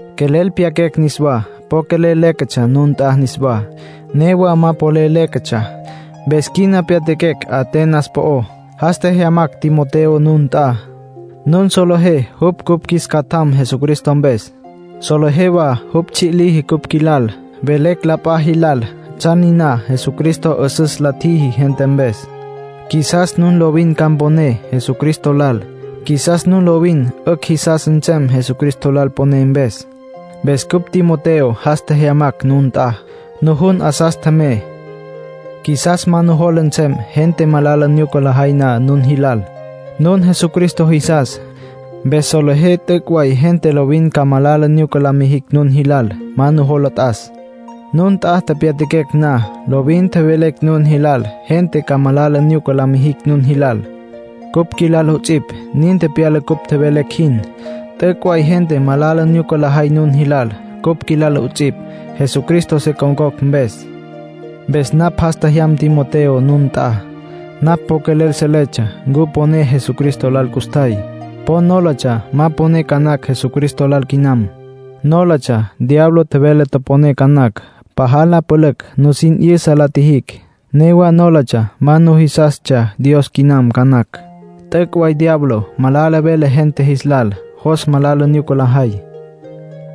Quelel pyaquecj niswá, po quelel léquetsja nun nt'a niswá. Newa ma polel léquetsja. Mpes quina pyatjaquecj Atenas po'ó. Jas tjejyamacj Timoteo nun nt'a. Nun solejé jupj cupj qjuis catjam Jesucristo mpes. Solejé wa jupj tsji' liji cupj qjuilal. Velecj la p'a jilal tsjan niná Jesucristo 'üsüs la tjiji gente mpes. Qjuisas nun lovin ca mponé Jesucristo lal. Qjuisas nun lovin 'ücj jisas nsem Jesucristo lal poné mpes. Mpes cupj Timoteo jas tjejyamacj nun nt'a, nujun 'asas tjemey. Qjuisas ma nujola nsem gente malala nyuca lajay na nun jilal. Nun Jesucristo jisas. Mpes solejé t'üc' way gente lovin ca malala nyuca la mijicj nun jilal. Ma nujola t'as. Nun nt'a tepyatjaquecj na, lovin tjevelecj nun jilal gente ca malala nyuca la mijicj nun jilal, cupj qjuilal 'ots'ipj. Nin tepyala cupj tjevelecj jin; t'üc' way gente malala nyuca lajay nun jilal, cupj qjuilal 'ots'ipj, Jesucristo se con̈cocj mpes. Mpes napj jas tjejyam Timoteo nun nt'a. Napj po quelel seletsja ncu poné Jesucristo lal custjay. Po nólatsja ma poné ca nacj Jesucristo lal quinam. Nólatsja diablo tjevele toponé ca nacj. Pajal la pülücj nusin 'yüsa la tjijicj; newa nólatsja ma nujisastsja Dios quinam ca nacj. T'üc' way diablo malala vele gente jis lal, jos malala nyuca lajay.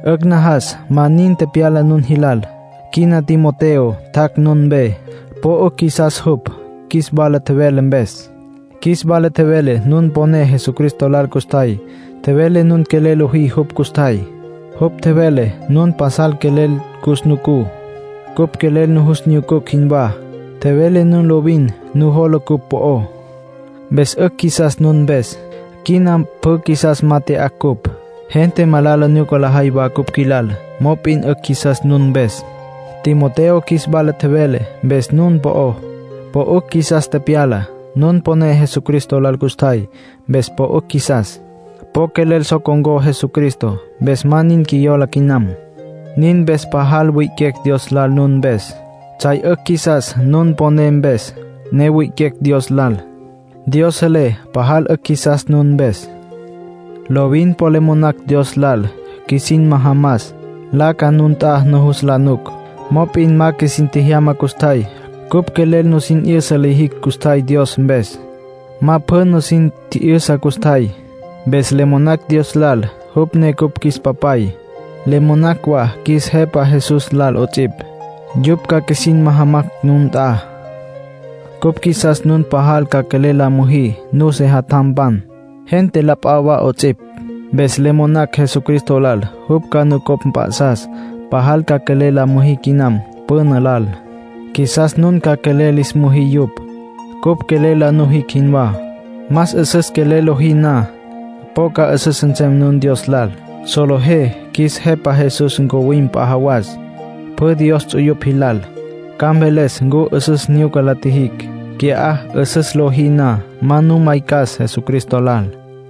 'Ücj najas ma nin tepyala nun jilal. Quina Timoteo tjac' nun mpe. Po 'ücj qjuisas jupj qjuis wala tjevele mpes. Qjuis wala tjevele nun poné Jesucristo lal custjay. Tjevele nun quelel lojí jupj custjay. Jupj tjevele nun pasal quelel cus nucú, cupj quelel nujus nyucucj jinwá. Tjevele nun lovin nujola cupj po'ó. Mpes 'ücj qjuisas nun mpes. Quina pjü qjuisas ma tya'acj ncupj. Gente malala nyuca lajay wa cupj qjuilal. Mop'in 'ücj qjuisas nun mpes. Timoteo qjuis wala tjevele mpes nun po'ó, po 'ücj qjuisas tepyala. Nun poné Jesucristo lal custjay, mpes po 'ücj qjuisas. Po quelel so con̈có Jesucristo. Mpes ma nin qjuiyola quinam. Nin mpes pajal wi'iquecj Dios lal nun mpes. Tsjay 'ücj qjuisas nun poné mpes, ne wi'iquecj Dios lal. Dios selé pajal 'ücj qjuisas nun mpes. Lovin po le monacj Dios lal qjuisin majamas, nlaca nun nt'a nujus la nuc. Mop'in ma qjuisin tjejyama custjay. Cupj quelel nusin 'yüsa lijicj custjay Dios mpes. Ma pjü nusin tji'yüsa custjay. Mpes le monacj Dios lal, jupj ne cupj qjuis Papay. Le monacj wa qjuis Jepa Jesús lal 'ots'ipj, yupj ca qjuisin majamacj nun nt'a. Cupj qjuisas nun pajal ca quelel la müjí nun sejatjampan, gente la p'a wa 'ots'ipj. Mpes le monacj Jesucristo lal jupj ca nucopj mp'a'sas pajal ca quelel la müjí quinam püna lal. Qjuisas nun ca quelel lis müjí yupj, cupj quelel la nujicj jinwá. Más 'üsüs quelel lojí na, po ca 'üsüs nsem nun Dios lal. Solejé qjuis Jepa Jesús ncuwim p'a jawas, pjü Dios ts'uyupj jilal. Ca mveles ncu 'üsüs nyuca la tjijicj. Qui'á 'üsüs lojí na, ma nu maycas Jesucristo lal.